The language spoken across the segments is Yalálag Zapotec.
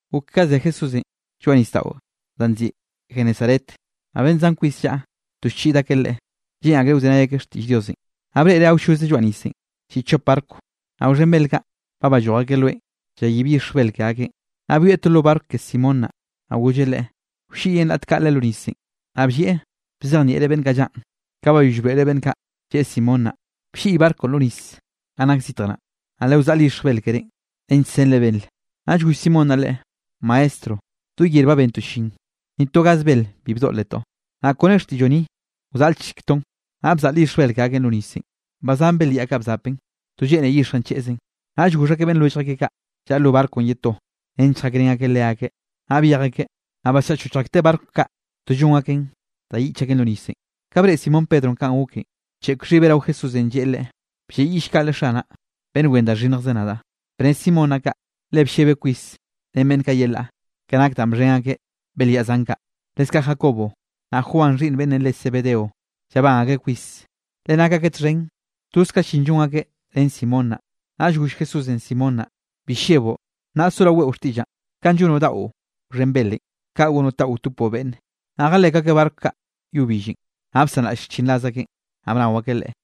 Gok ka ze Jesúsenꞌ lloaꞌ nisdaꞌo da nziꞌi Genesaret, naꞌ beꞌnn zan kwis llaꞌa, to llchiꞌd akeꞌ Leꞌe, lleꞌn akreꞌ wzenay akeꞌ xtiꞌll Diosenꞌ. Naꞌ breꞌreꞌ awlloze lloaꞌ nisenꞌ, lliꞌ chop barco, naꞌ wxhen belyaꞌ kaꞌ, ba balloj akeꞌ loenꞌ, llayib yixj bel ke akeꞌn. Naꞌ byoeꞌ to lo barco ke Simón naꞌ, naꞌ golleꞌ leꞌe, wlliꞌyeꞌn raꞌt kaꞌle lo nisenꞌ. Naꞌ bllieꞌ bzejnieꞌreꞌ beꞌnn kaꞌ llaꞌn. Ka bayoll broeꞌreꞌ beꞌnn kaꞌ, lleꞌe Simón naꞌ: —Blliꞌy barconꞌ lo nis ganꞌ nak zitj naꞌ, naꞌ lewzaꞌl yixj bel kerénꞌ nench senre bel. Naꞌll goll Simón naꞌ Leꞌe: —Maestro, do yer ba bentoꞌ llin, ni to gaz bel bi bdoꞌletoꞌ, nnaꞌ kone xtiꞌlloꞌ ni wzaꞌlchektoꞌn. Naꞌ bzaꞌl yixj bel ke akeꞌn lo nisenꞌ, ba zan belyaꞌ kaꞌ bzapen, to lleꞌne yixjenꞌ cheꞌzen. Naꞌll goxh akeꞌ beꞌnn lwellj akeꞌ kaꞌ, llaꞌa lo barconꞌ ye to nench lljakrén akeꞌ leakeꞌ, naꞌ byej akeꞌ, naꞌ basllaꞌchochj akteꞌ barco kaꞌ, to llon aken da yiꞌch aken lo nisenꞌ. Ka breꞌe Simón Pedronꞌ kanꞌ goken, bcheꞌk xhibeꞌn rao Jesúsenꞌ lleꞌe Leꞌe: —¡Blleꞌyiꞌll kaꞌle Xanaꞌ, beꞌnn wen da xhinnjze nadaꞌ! Bne Simón naꞌ kaꞌ, le bllebeꞌ kwis ren beꞌnn kaꞌ yelaꞌ, ke nak danꞌ bxhen akeꞌ belyaꞌ zan kaꞌ. Leskaꞌ Jacobo, naꞌ Juan xhiꞌnn beꞌnnenꞌ re Zebedeo, llabán akreꞌ kwis, le nak akeꞌ txhen toz ka llin llon akeꞌ ren Simón naꞌ. Naꞌll goll Jesúsenꞌ Simón naꞌ: —Bi lleboꞌ, nnaꞌ soraoꞌ weꞌo xtiꞌllaꞌn; kanꞌ llonoꞌ daꞌo wxhen belenꞌ, kaꞌ gonoꞌ taꞌo wtopoꞌ beꞌnne. Ka jalek akeꞌ barco kaꞌ yo billenꞌ, naꞌ bsanraꞌll xchinraz akeꞌn, naꞌ bnao akeꞌ Leꞌe.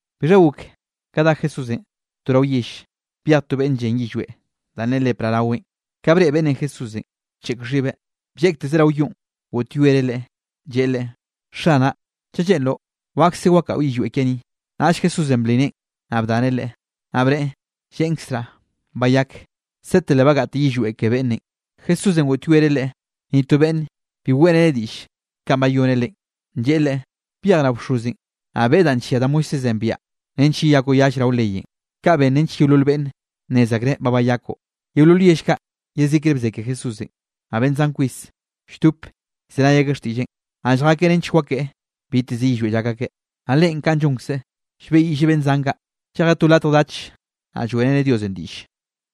Bixha gok ka dá Jesúsenꞌ to rao yell, byej to beꞌnn llen yillweꞌ danꞌ ne lepra raweꞌn. Ka breꞌe beꞌnnenꞌ Jesúsenꞌ, bcheꞌk xhibeꞌ, blleꞌktekzeꞌ rao yonꞌ, goꞌtyoereꞌ Leꞌe, lleꞌe Leꞌe: —Xanaꞌ, chaꞌ lleꞌnroꞌ, wakse wakaꞌo yillweꞌ kiaꞌ ni. Naꞌll Jesúsenꞌ bli neꞌen, naꞌ bdaneꞌ leꞌe, naꞌ bneꞌe: —Lleꞌnkzraꞌ, bayak. Sete le bagaꞌte yillweꞌ ke beꞌnnenꞌ. Jesúsenꞌ goꞌtyoereꞌ leꞌe, ni to beꞌnn bi weꞌreneꞌ diꞌll kanꞌ bayoneꞌ leꞌen, lleꞌe leꞌe: —Byej rao bxozenꞌ, naꞌ beꞌe danꞌ nllia da Moisésenꞌ biaꞌa, nench yeyakoꞌ yall rao leyenꞌ. Kaꞌ ben nench yeolol beꞌnne nnez akreꞌ ba bayakoꞌ. Yeolol yell kaꞌ, yezikre bze ke Jesúsenꞌ. Naꞌ beꞌnn zan kwis lldop llzenay akeꞌ xtiꞌlleꞌn, naꞌ lljakeꞌ nench wakeꞌe biteze yillweꞌ llak akeꞌ. Naꞌ Leꞌen ka llonkzeꞌ, llbeꞌyiꞌlleꞌ beꞌnn zan kaꞌ, llejeꞌ to latj dach, naꞌ lloeꞌreneꞌ Diosenꞌ diꞌlle.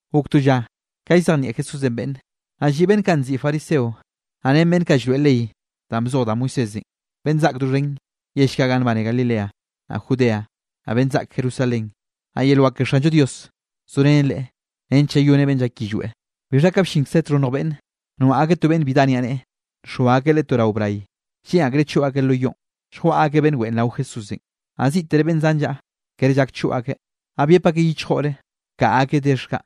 Gok to lla ka llzejnieꞌ Jesúsenꞌ beꞌnne, naꞌ lliꞌ beꞌnn kaꞌ nziꞌi fariseo, naꞌ ren beꞌnn kaꞌ llroeꞌ ley danꞌ bzoj da Moisésenꞌ, beꞌnn zaꞌk doxhen yell kaꞌ ganꞌ nbane Galilea, naꞌ Judea, naꞌ beꞌnn zaꞌk Jerusalén. Naꞌ yel wak ke Xanllo Dios zorenen Leꞌe nench llayoneꞌ beꞌnn llak yillweꞌ. Bixha ka bllinkze txhonnj beꞌnn, noaꞌ akeꞌ to beꞌnn bi dá niaꞌneꞌe, nxoa akeꞌ leꞌe to rao bray. Lleꞌn akreꞌ choꞌ akeꞌ lo yoꞌn, lljwaꞌa akeꞌ beꞌnn weꞌen rao Jesúsenꞌ. Naꞌ ziꞌtere beꞌnn zan llaꞌa, kere llak choꞌ akeꞌ, naꞌ byep akeꞌ yichjore, bkaꞌa akeꞌ dex kaꞌ,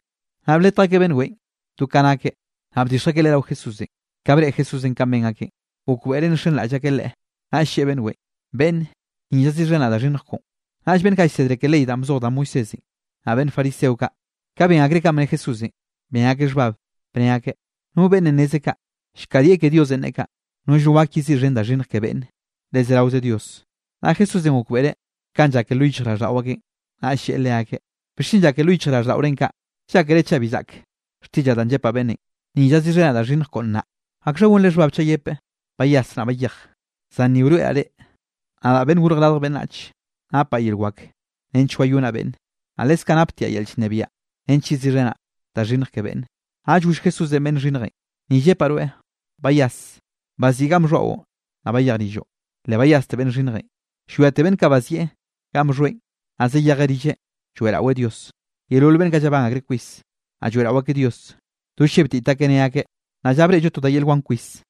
naꞌ bletj akeꞌ beꞌnn weꞌen do ka nakeꞌ, naꞌ bdixj akeꞌ leꞌe rao Jesúsenꞌ. Ka breꞌe Jesúsenꞌ kanꞌ ben akeꞌn, gokbeꞌreꞌ nxenraꞌll akeꞌ Leꞌe, naꞌll lleꞌe beꞌnn weꞌen: —Beꞌnne, ni llaziꞌxhenaꞌ da xhinnj koꞌon. Naꞌll beꞌnn kaꞌ llsedre ke ley danꞌ bzoj da Moisésenꞌ, naꞌ beꞌnn fariseo kaꞌ, ka ben akreꞌ kanꞌ bne Jesúsenꞌ, ben akeꞌ xhbab, bne akeꞌ: “¿No beꞌnnenꞌ nezeꞌ kaꞌ? Llkadieꞌ ke Diosenꞌ, neꞌe kaꞌ. Nollno gak yeziꞌxhen da xhinnj ke beꞌnne, le zeraoze Dios.” Naꞌ Jesúsenꞌ gokbeꞌreꞌ kanꞌ llake lo yichjraꞌlldaꞌo akeꞌn, naꞌll lleꞌe leakeꞌ: —¿Bixchen llake lo yichjraꞌlldaꞌorenꞌ kaꞌ? Llákere chaꞌ bi zaꞌk xtiꞌllaꞌ danꞌ llepaꞌ beꞌnnenꞌ: “Ni llaziꞌxhenaꞌ da xhinnj koꞌo naꞌn.” ¿Akxha gonre xhbab chaꞌ yepeꞌ: “Bayas naꞌ bayej”? Zan ni wroeꞌraꞌ reꞌ, nadaꞌ Beꞌnnenꞌ Gorj Radj Beꞌnnach, napaꞌ yel wak nench wayonaꞌ beꞌnne, naꞌ leskaꞌ naptiaꞌ yel llnebiaꞌ nench yeziꞌxhenaꞌ da xhinnj ke beꞌnne. Naꞌll goll Jesúsenꞌ beꞌnn xhinnjenꞌ: —Ni llepaꞌ rweꞌ, bayas, baziꞌi ganꞌ bxhoaꞌon, naꞌ bayej rilloꞌ. Le bayaste beꞌnn xhinnjenꞌ, llwiate beꞌnn kaꞌ bazieꞌ ganꞌ bxhoeꞌn, naꞌ zayejeꞌ rilleꞌ lloeꞌraweꞌ Dios. Yeolol beꞌnn kaꞌ llabán akreꞌ kwis, naꞌ lloeꞌrao akeꞌ Dios, do llebtit akeꞌ ne akeꞌ: —Nnaꞌ lla breꞌllo to da yel wan kwis.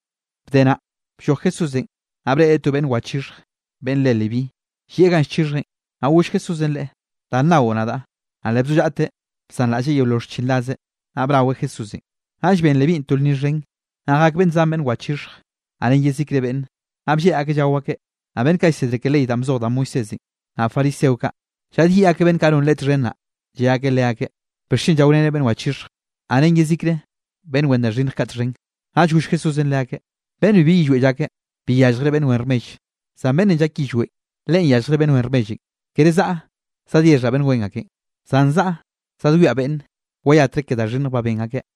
Bde naꞌ, blloj Jesúsenꞌ, naꞌ breꞌreꞌ to beꞌnn wachixhj beꞌnn re Leví. Llieꞌ ganꞌ llchixhjeꞌn, naꞌ goll Jesúsenꞌ leꞌe: —Da nnao nadaꞌ. Naꞌ le bzollaꞌteꞌ bsanraꞌlleꞌ yeolol xchinrazeꞌ, naꞌ bnaweꞌ Jesúsenꞌ. Naꞌll ben Levínꞌ to lnni xhen, naꞌ jak beꞌnn zan beꞌnn wachixhje, naꞌ ren yezikre beꞌnne. Naꞌ blleꞌ akeꞌ llao akeꞌ. Naꞌ beꞌnn kaꞌ llsedre ke ley danꞌ bzoj da Moisésenꞌ, naꞌ fariseo kaꞌ, llaꞌdyiꞌ akeꞌ beꞌnn kaꞌ non Leꞌe txhen naꞌ, lle akeꞌ leakeꞌ: —¿Bixchen llaorenre beꞌnn wachixhj, naꞌ ren yezikre beꞌnn wen da xhinnj kaꞌ txhen? Naꞌll goll Jesúsenꞌ leakeꞌ: —Beꞌnn bibi yillweꞌ llake, bi yalljreꞌ beꞌnn wen rmell, zan beꞌnnenꞌ llak yillweꞌn, leꞌen yalljreꞌ beꞌnn wen rmellenꞌ. Kere zaꞌa zadyexhaꞌ beꞌnn wen akenꞌ, zan zaꞌa zadwiaꞌ beꞌnn wayatre ke da xhinnj ba ben akeꞌ.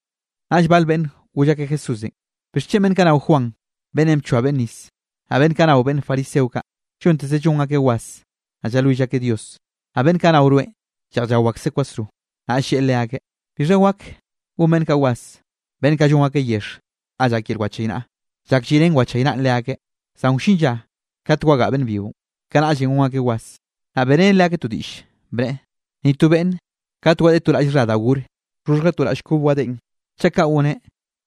Naꞌll bal beꞌnn goll akeꞌ Jesúsenꞌ: —¿Bixchen beꞌnn kaꞌ nao Juan beꞌnnenꞌ bchoa beꞌnn nis, naꞌ beꞌnn kaꞌ nao beꞌnn fariseo kaꞌ, llonteze llon akeꞌ was, naꞌ llalwill akeꞌ Dios, naꞌ beꞌnn kaꞌ nao rweꞌn lleꞌj llao akseꞌ kwasro? Naꞌll lleꞌe leakeꞌ: —¿Bixha wak gon beꞌnn kaꞌ was, beꞌnn kaꞌ llon akeꞌ yexh ga llak yel wachaynaꞌa chak lliꞌrén wachaynaꞌn leakeꞌ? Zan wllin lla kate wagaꞌa beꞌnn byionꞌ, kanaꞌllenꞌ gon akeꞌ was. Naꞌ beꞌreneꞌ leakeꞌ to diꞌll, bneꞌe: —Ni to beꞌnne, kate wadeꞌe to raꞌll xha da gor, wxhoxhjeꞌ to raꞌll kob wadeꞌen. Chaꞌ kaꞌ goneꞌ,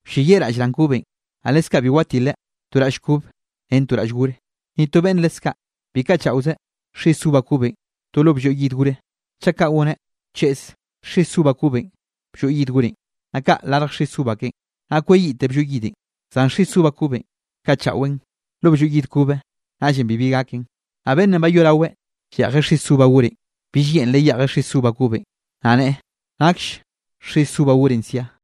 wlleyiꞌ raꞌll raꞌn kobenꞌ. Naꞌ leskaꞌ bi watilen to raꞌll kob ren to raꞌll gore. Ni to beꞌnn leskaꞌ bi kaꞌchaꞌozeꞌ xis uva kobenꞌ to lo blloy yid gore. Chaꞌ kaꞌ goneꞌ, wcheꞌz xis uva kobenꞌ blloy yid gorenꞌ, naꞌ kaꞌ larj xis uva keꞌen, naꞌ kweyiꞌte blloy yidenꞌ. Zan xis uva kobenꞌ kaꞌchaꞌweꞌn lo blloy yid kobe, naꞌllenꞌ bibi gaken. Naꞌ beꞌnnenꞌ bayoꞌraweꞌ lleꞌjeꞌ xis uva gorenꞌ, bill yeꞌnreꞌ yeꞌjeꞌ xis uva kobenꞌ, naꞌ nneꞌe: “Nakll xis uva gorenꞌ sia.”